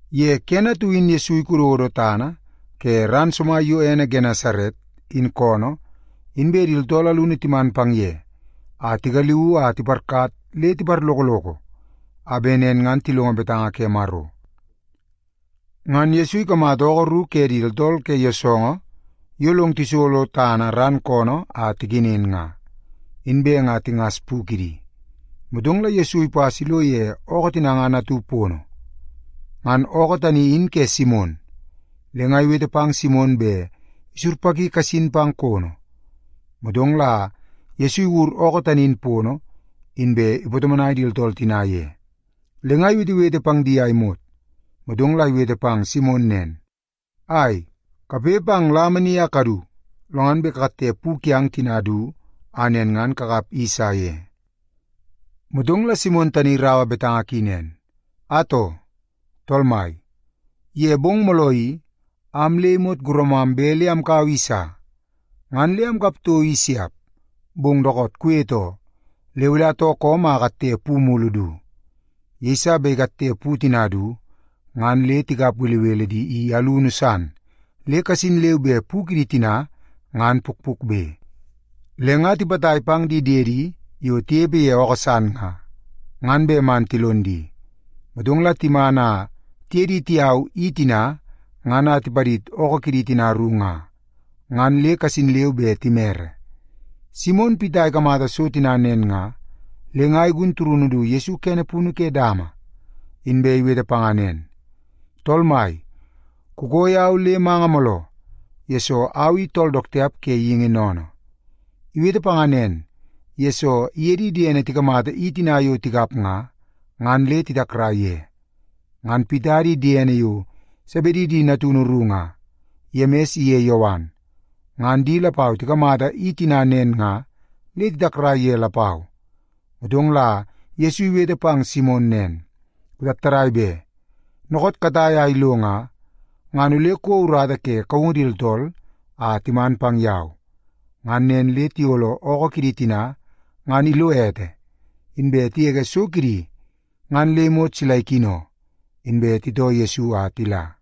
Ye kene atu in Yesu ikododo tana ke ran somai yo ene Genesaret, in koonoo, inbe di tooltool alunu timan pang ye a tigaliuu a tiparkat le tiparlokoloko a bet nen ngan tilongo betanga ke Maro. Ngan Yesu ikamata ookoo ru ke di tooltool ke yoosoongoo yo long tisolo tana ran koonoo a tikenen nga, inbe nga tingas pu kidi. Motong la Yesu ipas a ilo ye ookoo tina ngan atu pono. Ngan ookoo tani in ke Simon, le nga iwete pang Simon bet isurpaki kasin pang kono. Motong la Yesu iwur ookoo tani in pono, inbe ipatomonai di tooltool tina ye. Le nga iwetewete pang di a imot, motong la iwete pang Simon nen, “Ai, kapoi pang lama ni a kadu, lo ngan bet kakatte pu kiang tina du, a nen ngan kakap i sa ye.” Motong la Simon tani iraua betanga ki nen, “Atoo, tool mai, ye bong mooloo i, am le imot guramam bet le amkaua i sa, ngan le amkap toko i siap. Bong dookoot kuwete oo, le ole atoo koom a akatte pu mulu du.” Yeiso bet tikatte pu tina du ngan le tikap belebele di i alunu san le kasin leu be pu kidi tina ngan pukpukbe. Le nga tipatai pang di diedi yo tinepe ye ookoo san nga, ngan bet man tilon di. Motong la timan a tiye di tiyau i tina ngan a tipadid ookoo kidi tina ru nga, ngan le kasin leu be timere. Simon Pita ikamata so tina nen nga, le nga igun turunu du Yesu kene punu ke dama, inbe iwete panga nen, “Tool Mai, kukoo yau le manga mooloo, yesoo au i tool dook tiap ke geingi sennene.” Iwete panga nen, yesoo iye di diene tikamata i tina yo tikap nga, ngan le titakrai ye. Ngan Pita di diene yo Sebedi di natunu ru nga, Yemis iye Yowan, ngan di lapau tikamata i tina nen nga le titakrai ye lapau. Motong la Yesu iwete pang Simon nen, “Kutattadai be! Dookoot katai a ilo nga, ngan ole kouo urata ke kaungu di tooltool a timan pang yau.” Ngan nen le tiyolo ookoo kidi tina ngan ilo ete, inbe tigege so kidi ngan le imot sila ikino, inbe titoo Yesu a tila.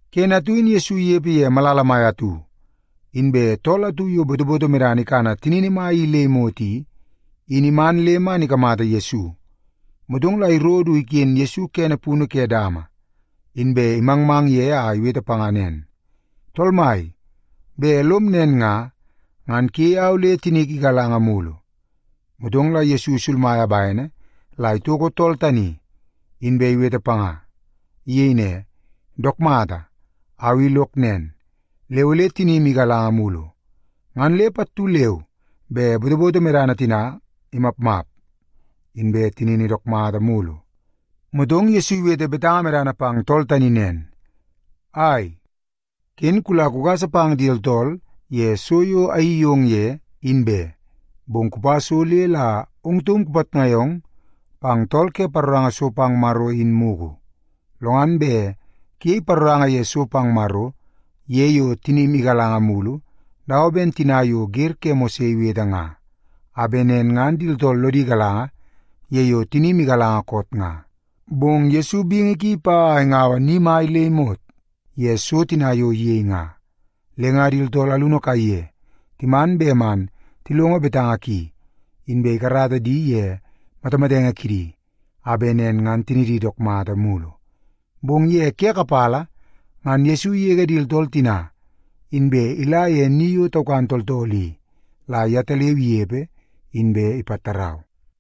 Kene atu in Yesu inepe ye malala mai atu, inbe tool atu yo botoboto medana ikana tinini mai i le imot i, in iman le man ikamata Yesu. Motong la iro du iken Yesu kene punu ke dama, inbe imangmang ye a iwete panga nen, “Tool Mai, bet lom nen nga, ngan kuyei au le tinik igalanga mulu.” Motong la Yesu isulmaia bene la itoko tool tani, inbe iwete panga. Iyei ne, “Dook mata, au i lok nen, le ole tinim igalanga mulu.” Ngan le pattu leu be botoboto medana tina imapmap, inbe tinini dook mata mulu. Motong Yesu iwete betanga medana pang tool tani nen, “Ai, ken kula kugasa pang di tooltool ye so yo ayeii yong ye, in be. Bong kupa so le la ong taum kupitnai ong pang tool ke paroranga so pang Maro in mugu. Lo ngan bet kuyei paroranga ye so pang Maro ye yo tinim igalanga mulu, dawa ben tina yo wer ke Mose iwete nga, a bet nen ngan di tooltool lodi galanga ye yo tinim igalanga koot nga.” Bong Yesu bingi ki ipa a ingaua ni mai le imot ye so tina yo iyei nga. Le nga di tooltool alunu kaiye timan bet man tilongo betanga ki, inbe ikarata di ye matamatenge kidi a bet nen ngan tinidi dook mata mulu. Bong ye ke kapala ngan Yesu igege di tooltool tina, inbe ila ye ni yo taukan tooltool i la yetaleu inepe, inbe ipatarau.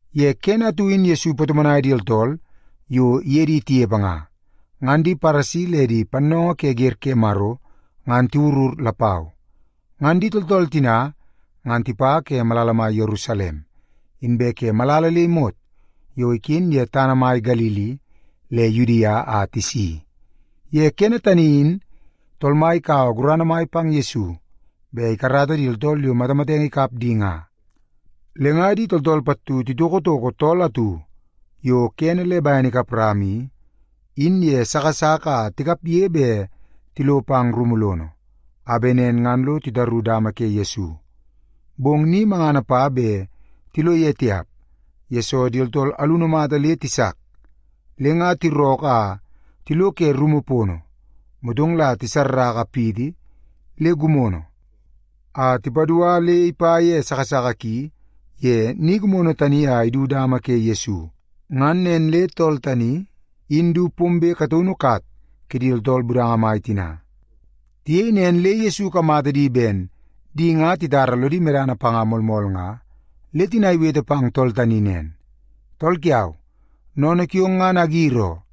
Ye kene atu in Yesu ipatomonai di tooltool yo iye di tinepe nga, inbe di Paresi le di pannoongoo ke wer ke Maro ngan tiwurur lapau. Ngan di tooltool tina ngan tipa ke malala mai Yerusalem, inbe ke malala le imot yo iken ye tana mai Galili le Yudia a tisi. Ye kene tani in Tool Mai ikaua gurana mai pang Yesu bet ikarata di tooltool yo matamatenge ikap di nga. Le nga di tooltool pattu titokotoko tool atu yo kene le bene ikap rama i, in ye moi ki a tikapge bet tilo pang rumu lono, a bet nen ngan lo titaru dama ke Yesu. Bong ni mangana pa bet tilo ye tiap, yesoo di tooltool alunu mata le tisak. Le nga tirookoo a tilo ke rumu pono, motong la tisaua ni gimono atu a tipadua le ipa ye moi ki ye ni gimono tani a idu dama ke Yesu. Ngan nen le tool tani in du pombe kataunu kat kidi tooltool budanga mai tina. Tiyei nen le Yesu ikamata di ben di nga titara lodi medana panga moolmool nga, le tina iwete pang tool tani nen, “Tool kiau, sennene kiong ngan agir oo.”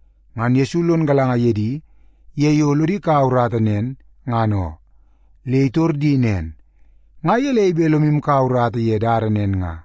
Ngan Yesu lon galanga ye di ye yo lodi kaua urata nen, ngan oo, le nga itor di nen, “Nga gelei bet lomu kaua urata ye dada nen nga?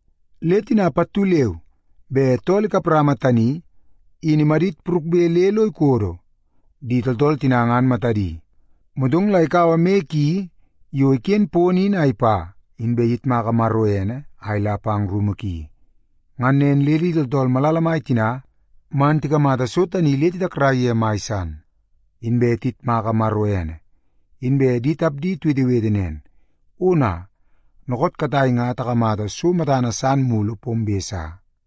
Le tina pattu leu be tool ikap rama tani in imadit purukbe le lo ikodo di tooltool tina ngan matadi. Motong la ikaua moi ki yo iken pono in a ipa, inbe iyitmaka Maro ene a ila pang rumu ki. Ngan nen le di tooltool malala mai tina ngan tikamata so tani le titakrai ye mai san, inbe tiyitmaka Maro ene. Inbe di tapdi tiwetewete nen, “Ona! Dookoot katai nga takamata so matana san mulu pombe sa.”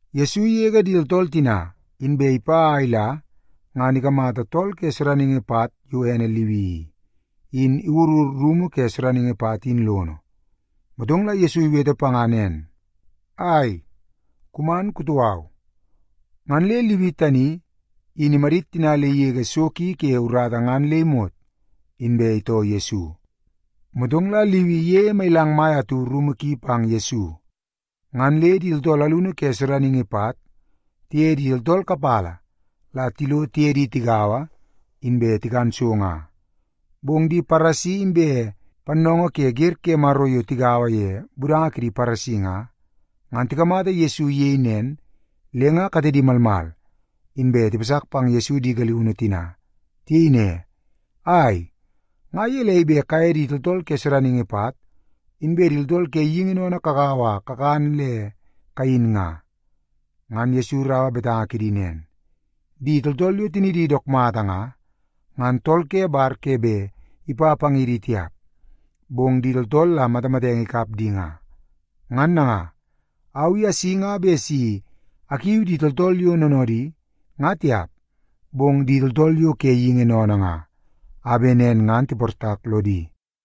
Yesu igege di tooltool tina, inbe ipa a ila ngan ikamata tool ke sodaningi pat yo ene Liwi i, in iwurur rumu ke sodaningi pat in lono. Motong la Yesu iwete panga nen, “Ai, kuman kutoo au.” Ngan le Liwi tani in imadit tina le igege so ki ke urata ngan le imot, inbe itoo Yesu. Motong la Liwi iyeie mailang mai atu rumu ki pang Yesu. Ngan le di tooltool alunu ke sodaningi pat tiye di tooltool kapala la tilo tiye di tigaua, inbe tikan so nga. Bong di Paresi inbe pannoongoo ke wer ke Maro yo tigaua ye budanga kidi Paresi nga, ngan tikamata Yesu iyei nen, le nga katedi malmal, inbe tipasak pang Yesu di galiunu tina. Tiyei ne, “Ai, nga gelei bet kaye di tooltool ke sodaningi pat inbe di tooltool ke geingi sennene kagaua a kakan le kayin nga?” Ngan Yesu iraua betanga kidi nen, “Di tooltool yo tinidi dook mata nga, ngan tool ke bar ke bet ipa pang ye di tiap, bong di tooltool la matamatenge ikap di nga. Ngan nanga, au i asi nga bet si akiu di tooltool yo noonoodi nga tiap, bong di tooltool yo ke geingi sennene nga, a bet nen ngan tiportak lodi.”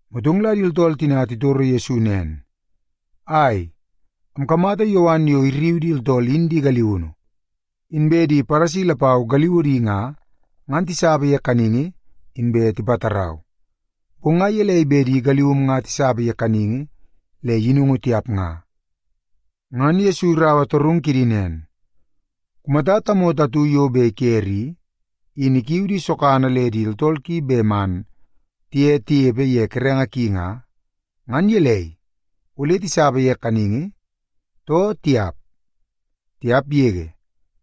Motong la di tooltool tina titoro Yesu nen, “Ai, amkamata Yowan yo irriu di tooltool in di galiunu, inbe di Paresi lapau galiudi nga, ngan tisapa ye kaningi inbe tipatarau. Bong nga gelei bet di galium nga tisapa ye kaningi le yinungu tiap nga?” Ngan Yesu iraua torungu kidi nen, “Kumata tamoto atu yo bet ikere i, in ikiu di sogana le di tooltool ki bet man tiye tinepe ye kerenge ki nga, ngan gelei, ole tisapa ye kaningi, too tiap? Tiap yege!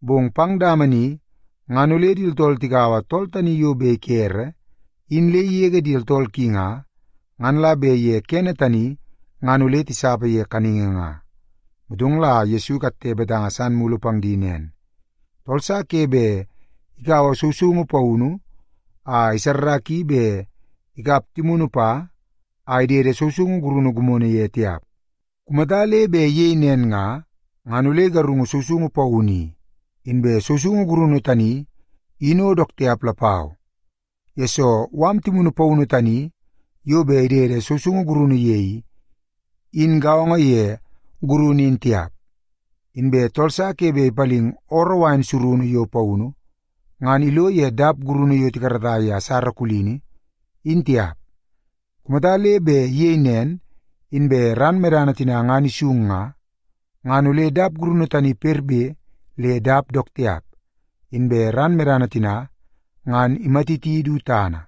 Bong pang dama ni ngan ole di tooltool tikaua tool tani yo bet ikere in le igege di tooltool ki nga, ngan la bet ye kene tani ngan ole tisapa ye kaningi nga.” Motong la Yesu ikatte betanga san mulu pang di nen, “Tool sa ke bet ikaua sousoungu paunu a isarraki bet ikap timunu pa a idede sousoungu gurunu gimono ye tiap. Kumata le bet iyei nen nga, ngan ole igarungu sousoungu paunu i, inbe sousoungu gurunu tani in o dook tiap lapau, yesoo mala timunu paunu tani yo bet idede sousoungu gurunu ye i, in gaongo ye gurunu in tiap. Inbe tool sa ke bet ipaling ooroo wain surunu yo paunu, ngan ilo ye dap gurunu yo tikarata ye asara kulini, in tiap. Kumata le bet iyei nen, inbe ran medana tina ngan isung nga, ngan ole dap gurunu tani perbe le dap dook tiap, inbe ran medana tina ngan imatiti du tana.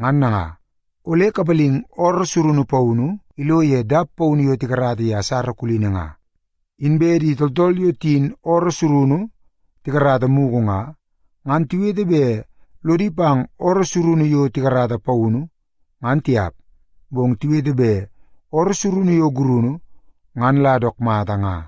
Ngan nanga, ole kapalingi ooroo surunu yo paunu ngan ilo ye dap paunu yo tikarata ye asara kulini nga. Inbe di tooltool yo tiyin ooroo surunu tikarata mugu nga, ngan tiwete bet lodi pang ooroo surunu yo tikarata paunu, ngan tiap. Bong tiwete bet ooroo surunu yo gurunu, ngan la dook mata nga.”